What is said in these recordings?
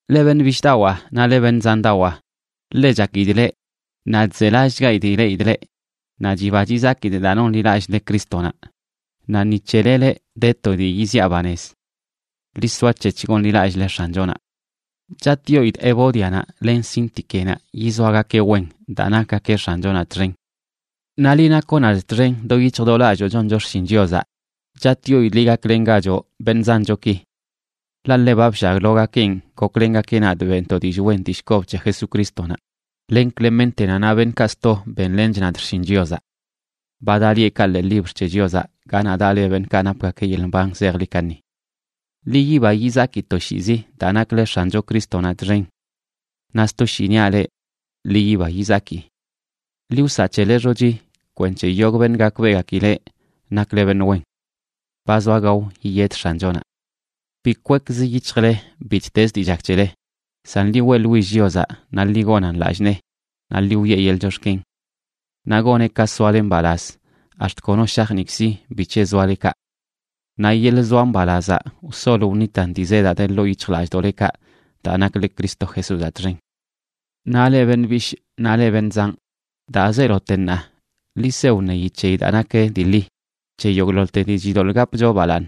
Leꞌ beṉꞌ bishꞌdawaa naꞌ leꞌ beṉꞌ zandawaa, ḻe chakidꞌ leꞌ, naꞌ chzelallꞌchgaidꞌ ileꞌidꞌ leꞌ, naꞌ chiba chizakidꞌ daa nonḻilallꞌle Crístonaꞌ, naꞌ ni c̱hele leꞌ de to dii yiziꞌa banez. Ḻi soac̱hec̱h gonḻilallꞌle X̱anchonaꞌ. Chatꞌyoidꞌ Evódianaꞌ len Síntiquenaꞌ yizoagakeꞌ wen daa nakgakeꞌ X̱anchonaꞌ txen. Naꞌ liꞌ nakoꞌ nadꞌ txen do yic̱hj do lalloo choncho xshin Chiozaꞌ, chatꞌyoidꞌ liꞌ, gaklengachoꞌ beṉꞌ zanchoki. Ḻaꞌ ḻe ba bllaglogakenꞌ goklengakeꞌ nadꞌ beꞌntoꞌ dillꞌ wen dillꞌ kob c̱he Jesucrístonaꞌ, len Cleméntenaꞌ naꞌ beṉꞌkaꞌ sto benlench nadꞌ xshin Chiozaꞌ. Ba daꞌ lieꞌkaꞌ ḻee libr c̱he Chiozaꞌ ganaꞌ daꞌ le beṉꞌkaꞌ napgakeꞌ yeḻꞌ mban zejḻi kaṉi. Ḻi yiba yizaki toshiizi daa nakle X̱ancho Crístonaꞌ txen. Naꞌ sto shii niaꞌ leꞌ: ¡ḻi yiba yizaki! Ḻi wsaꞌ c̱hele xochi kwenc̱he yogꞌ beṉꞌ gakbeꞌgakileꞌ nakle beṉꞌ wen. Ba zoa gao yiyed X̱anchonaꞌ. Bi kwekzə yic̱hjle bittez dii chak c̱hele, san ḻi weꞌḻwill Chiozaꞌ naꞌ ḻi gonan lallꞌ nee, naꞌ ḻi wiꞌe yeḻꞌ chox̱ken. Naꞌ goneꞌ ka soale mbalaz ax̱t kono shajniikzi bic̱he zoale kaꞌ. Naꞌ yeḻꞌ zoa mbalazaꞌ wsol wṉitan dii zedaꞌ de ḻoo yic̱hjlallꞌdoꞌlekaꞌ daa nakle Cristo Jesúzaꞌ txen. Naꞌ leꞌ beṉꞌ bishꞌ naꞌ leꞌ beṉꞌ zanꞌ, daa zeelote ṉaa, ḻi se wṉeyi c̱heyi daa nak dii ḻi, c̱he yogꞌḻoḻte dii chidoḻꞌ gapcho balaaṉ,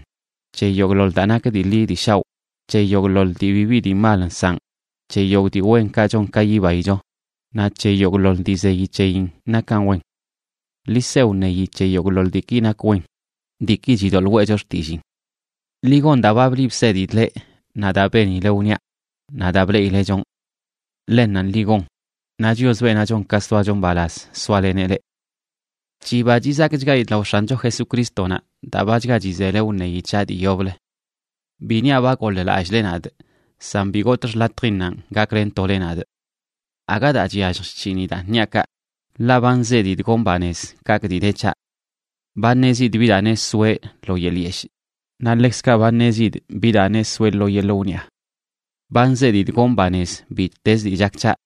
c̱he yogꞌḻoḻ daa nak dii ḻi dii shaoꞌ, c̱he yogꞌḻoḻ dii bibi dii mal nsaꞌn, c̱he yogꞌ dii wenkaꞌ chon ka yibaicho, naꞌ c̱he yogꞌḻoḻ dii zeyi c̱heyin nakan wen. Ḻi se wṉeyi c̱he yogꞌḻoḻ diiki nak wen, diiki chidoḻꞌ weꞌcho xtilliin. Ḻi gon daa ba bliꞌ bsedidꞌ leꞌ naꞌ daa benile wniaꞌ, naꞌ daa bleꞌile chonꞌ. Ḻennanꞌ ḻi gon, naꞌ Chios, beenaꞌ chon ka soacho mbalaz, soaleneꞌ leꞌ. Chiba chizakchgaidꞌ lao X̱ancho Jesucrístonaꞌ daa bachga chizele wṉeyi c̱haꞌ dii yoblə. Bi niaꞌ ba goḻ-lallꞌle nadꞌ, san bi gotꞌ xḻatjinnanꞌ gaklentole nadꞌ. Aga daa chyallj chc̱hinidaꞌn niaꞌ kaꞌ, ḻaꞌ ba nzedidꞌ gonꞌ banez kaꞌkꞌ dii de c̱haꞌ. Ba ṉezidꞌ bi daa neꞌ soeꞌ lo yeḻꞌ yeshꞌ, naꞌ ḻekzkaꞌ ba ṉezidꞌ bi daa neꞌ soeꞌ lo yeḻꞌ wniaꞌ. Ba nzedidꞌ gonꞌ banez bittez dii chak c̱haꞌ,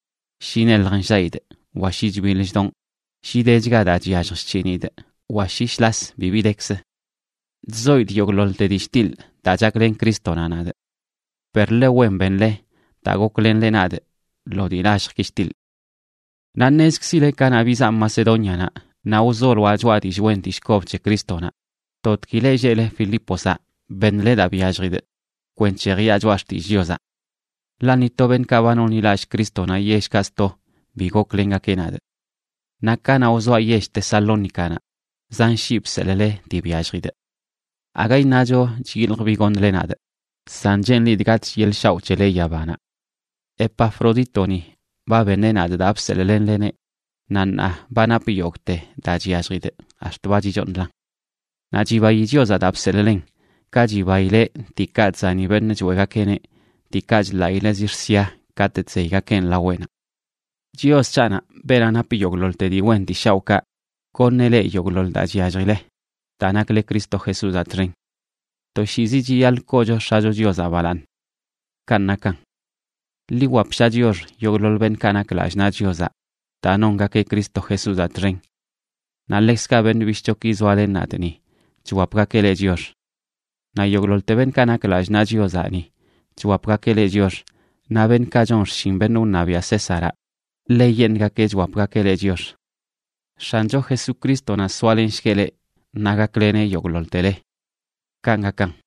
shi neḻj nllaꞌidꞌ wa shi chbiḻ chdonꞌ, shi dechga daa chyallj chc̱hinidꞌ wa shi shlas bibi dekzə. Chzoidꞌ yogꞌḻoḻte dii chtiḻꞌ daa chaklen Crístonaꞌ nadꞌ. Per ḻe wen benle daa goklenle nadꞌ lo dii lalljki chtiḻꞌ. Naꞌ ṉezkzile kanaꞌ bizaa Macedónianaꞌ naꞌ wzoloaꞌ choꞌa dillꞌ wen dillꞌ kob c̱he Crístonaꞌ, totgui leꞌ lleꞌle Filipozaꞌ beṉle daa byalljidꞌ kwenc̱he jiꞌa choꞌa xtillꞌ Chiozaꞌ. Ḻaꞌ ni to beṉꞌkaꞌ ba nonḻilallꞌ Crístonaꞌ yellkaꞌ sto bi goklengakeꞌ nadꞌ. Naꞌ kanaꞌ wzoaꞌ yell Tesalónicanaꞌ, zan shii bseḻꞌle dii byalljidꞌ. Aga iṉacho chyiljꞌ bi goṉle nadꞌ, san cheenlidꞌ gatꞌch yeḻꞌ shaoꞌ c̱hele yabanaꞌ. Epafrodítoni ba beṉeꞌ nadꞌ daa bseḻꞌlenleneꞌ, naꞌ ṉaa ba napꞌ yogꞌte daa chyalljidꞌ ax̱t ba chichooṉlan. Naꞌ chibayi Chiozaꞌ daa bseḻꞌlen, ka chibaileꞌ diikaꞌ chzani beṉꞌ choeꞌgakeꞌneꞌ, diikaꞌ chḻaꞌileꞌ zix̱ sia katꞌ chzeygakeꞌn laweꞌnaꞌ. Chios c̱haꞌnaꞌ, beenaꞌ nap yogꞌḻoḻte dii wen dii shaoꞌkaꞌ, goṉeꞌ leꞌ yogꞌḻoḻ daa chyalljile daa nakle Cristo Jesúzaꞌ txen. Toshiizi chiyaḻꞌ koocho X̱acho Chiozaꞌ balaaṉ. Kanꞌ nakan. Ḻi wwapsha chiox yogꞌḻoḻ beṉꞌkaꞌ nak lallꞌ naꞌ Chiozaꞌ daa nongakeꞌ Cristo Jesúzaꞌ txen. Naꞌ ḻekzkaꞌ beṉꞌ bishꞌchoki zoalen nadꞌ ni, chwapgakeꞌ leꞌ chiox. Naꞌ yogꞌḻoḻte beṉꞌkaꞌ nak lallꞌ naꞌ Chiozaꞌ ni chwapgakeꞌ leꞌ chiox, naꞌ beṉꞌkaꞌ chon xshin beṉꞌ wṉabiaꞌ Césaraꞌ, ḻeyeṉꞌgakeꞌ chwapgakeꞌ leꞌ chiox. X̱ancho Jesucrístonaꞌ soalenshgueꞌ leꞌ naꞌ gakleneꞌ yogꞌḻoḻtele. Kanꞌ gakan.